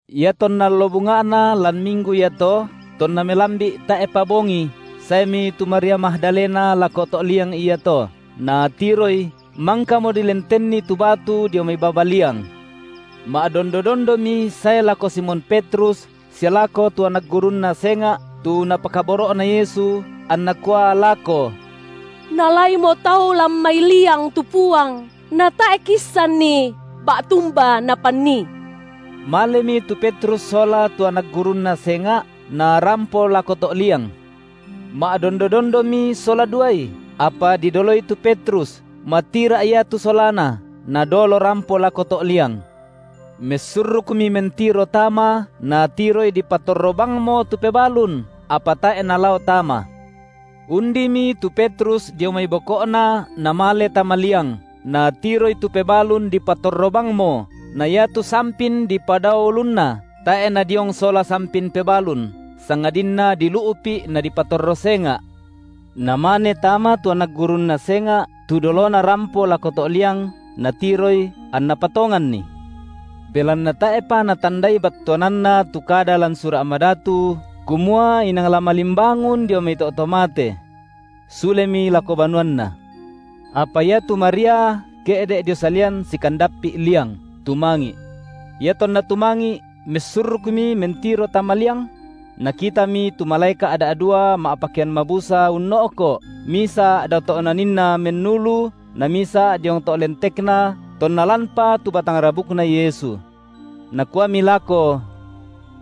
Iatonna allo bunga’na lan minggu iato tonna melambi’ tae’pa bongi, saemi tu Maria Magdalena lako to’ liang iato, natiroi mangkamo dilentenni tu batu dio mai baba liang. Ma’dondo-dondomi sae lako Simon Petrus sia lako tu anak gurunNa senga’, tu Napakaboro’na Yesu, anna kua lako: Naalaimo tau lan mai liang tu Puang, na tae’ kiissanni ba’tumba napannii. Malemi tu Petrus sola tu anak gurunNa senga’, narampo lako to’ liang. Ma’dondo-dondomi sola duai, apa didoloi tu Petrus, matira’ ia tu solana, nadolo rampo lako to’ liang. Messurrukmi mentiro tama, natiroi dipatorro bangmo tu pebalun, apa tae’ nalao tama. Undimi tu Petrus dio mai boko’na namale tama liang, natiroi tu pebalun dipatorro bangmo, na iatu sampin dipadao ulunNa, tae’ nadiong sola sampin pebalun, sangadinna dilu’pi’ nadipatorro senga’. Namane tama tu anak gurunNa senga’ tu dolona rampo lako to’ liang, natiroi anna patonganni. Belanna tae’pa natandai battuananna tu kada lan Sura’ Madatu kumua inang la malimbangun dio mai to’ to mate. Sulemi lako banuanna. Apa iatu Maria ke’de’ dio salian sikandappi’ liang, tumangi’. Iatonna tumangi’ messurrukmi mentiro tama liang; nakitami tu malaeka’ da’dua ma’pakean mabusa unno’ko’, misa’ dao to’ naninna mennulu namisa’ diong to’ lentekna tonna lanpa tu batang rabukNa Yesu. Nakuami lako: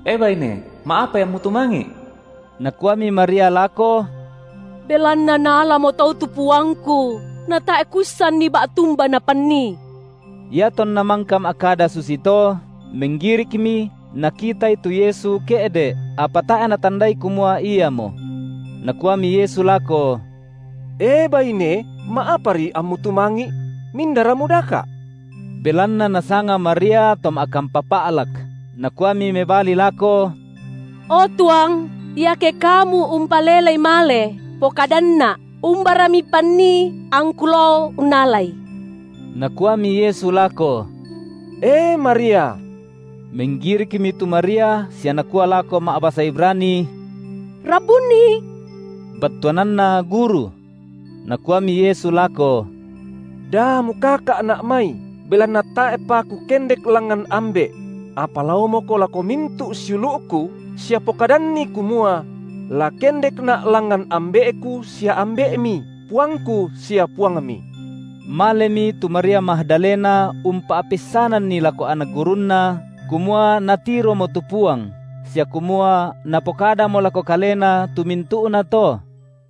E baine, ma’apai ammu tumangi’? Nakuami Maria lako: Belanna naalamo tau tu Puangku, natae’ kuissanni ba’tumba napanii. Iatonna mangka ma’kada susito, menggirikmi nakitaI tu Yesu ke’de’, apa tae’ natandai kumua Iamo. Nakuami Yesu lako: E baine, ma’apari ammu tumangi’? Mindara mudaka’? Belanna nasanga Maria to ma’kampa pa’lak, nakuami mebali lako: O tuang, iake kamu umpalelei male, pokadanna’ umbara Mipannii, angku lao unnalaI. Nakuami Yesu lako: E Maria. Menggirikmi tu Maria sia nakua lako ma’basa Ibrani: Rabbuni! battuananna: Guru. Nakuami Yesu lako: Da mukaka’Na’ mai, belanna tae’pa Kukendek langngan Ambe’; apa laomoko lako mintu’ siulu’Ku, sia pokadanni kumua: La kendekNa’ langngan Ambe’Ku sia Ambe’mi, PuangKu sia Puangmi. Malemi tu Maria Magdalena umpa’peissananni lako anak gurunNa kumua natiromo tu Puang sia kumua Napokadamo lako kalena tu mintu’nato.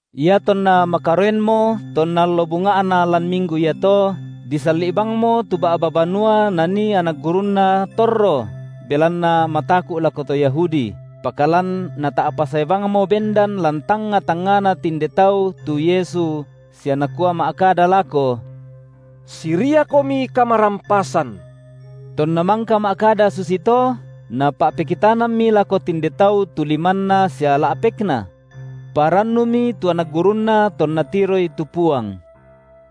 Iatonna makaroenmo tonna allo bunga’na lan minggu iato, disalli’ bangmo tu ba’ba banua nanii anak gurunNa torro belanna mataku’ lako to Yahudi, pakalan Nata’pa sae bangmo bendan lan tangnga-tangngana tinde tau tu Yesu sia Nakua ma’kada lako: Siriakomi kamarampasan! Tonna mangka ma’kada susito, Napa’pekitanammi lako tinde tau tu limanNa sia la’pekNa. Parannumi tu anak gurunNa tonna tiroi tu Puang.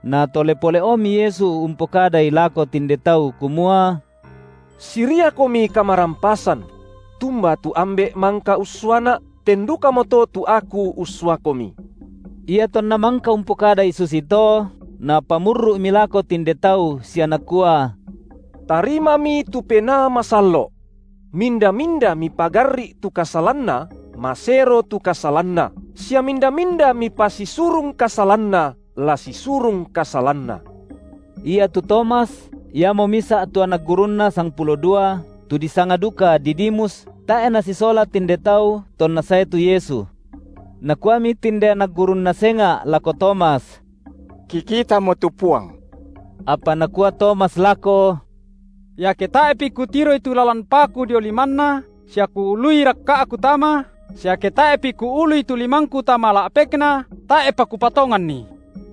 Natole pole’omi Yesu umpokadai lako tinde tau kumua: Siriakomi kamarampasan! Tumba tu Ambe’ mangka ussuaNa’, ten dukamoto tu Aku ussuakomi. Iatonna mangka umpokadai susito, Napamurru’mi lako tinde tau sia Nakua: Tarimami tu Penaa Masallo’. Minda-minda mipagarri’ tu kasalanna, masero tu kasalanna, sia minda-minda mipasisurung kasalanna, la sisurung kasalanna. Iatu Tomas, iamo misa’ tu anak gurunNa sangpulo dua, tu disanga duka Didimus, tae’ nasisola tinde tau tonna sae tu Yesu. Nakuami tinde anak gurunNa senga’ lako Tomas: Kikitamo tu Puang. Apa nakua Tomas lako: Iake tae’pi kutiroi tu lalan paku dio limanNa sia kuului rakka’ku tama, sia ke tae’pi kuului tu limangku tama la’pekNa, tae’pa kupatonganni.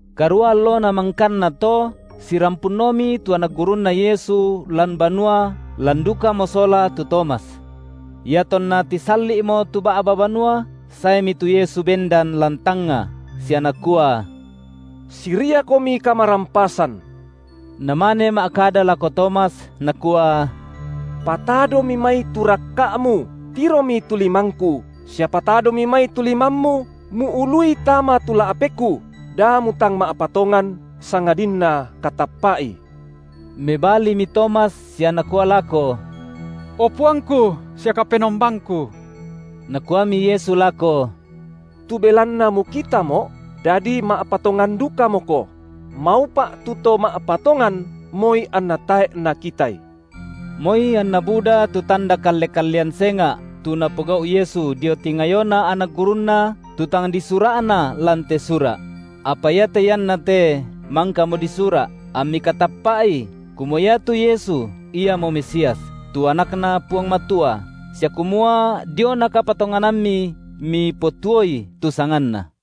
Karua allona mangkanna to sirampunomi tu anak gurunNa Yesu lan banua lan dukamo sola tu Tomas. Iatonna tisalli’mo tu ba’ba banua, saemi tu Yesu bendan lan tangnga sia Nakua: Siriakomi kamarampasan! Namane ma’kada lako Tomas, Nakua: Patadomi mai tu rakka’mu, tiromi tu limangKu, sia patadomi mai tu limammu muului tama tu la’pekKu, da mutang ma’patongan, sangadinna katappa’i. Mebalimi Tomas sia nakua lako: O Puangku sia Kapenombangku. Nakuami Yesu lako: Tu belanna mukitaMo’, dadi ma’patongan dukamoko; maupa’ tu to ma’patongan, moi anna tae’ nakitai. Moi anna buda tu tanda kalle-kallean senga’ tu Napogau’ Yesu dio tingayona anak gurunNa tu tang disura’na lan te sura’; apa iate iannate mangkamo disura’, ammi katappa’i kumua iatu Yesu Iamo Mesias, tu AnakNa Puang Matua, sia kumua diona kapatonganammi mipotuoi tu sanganNa.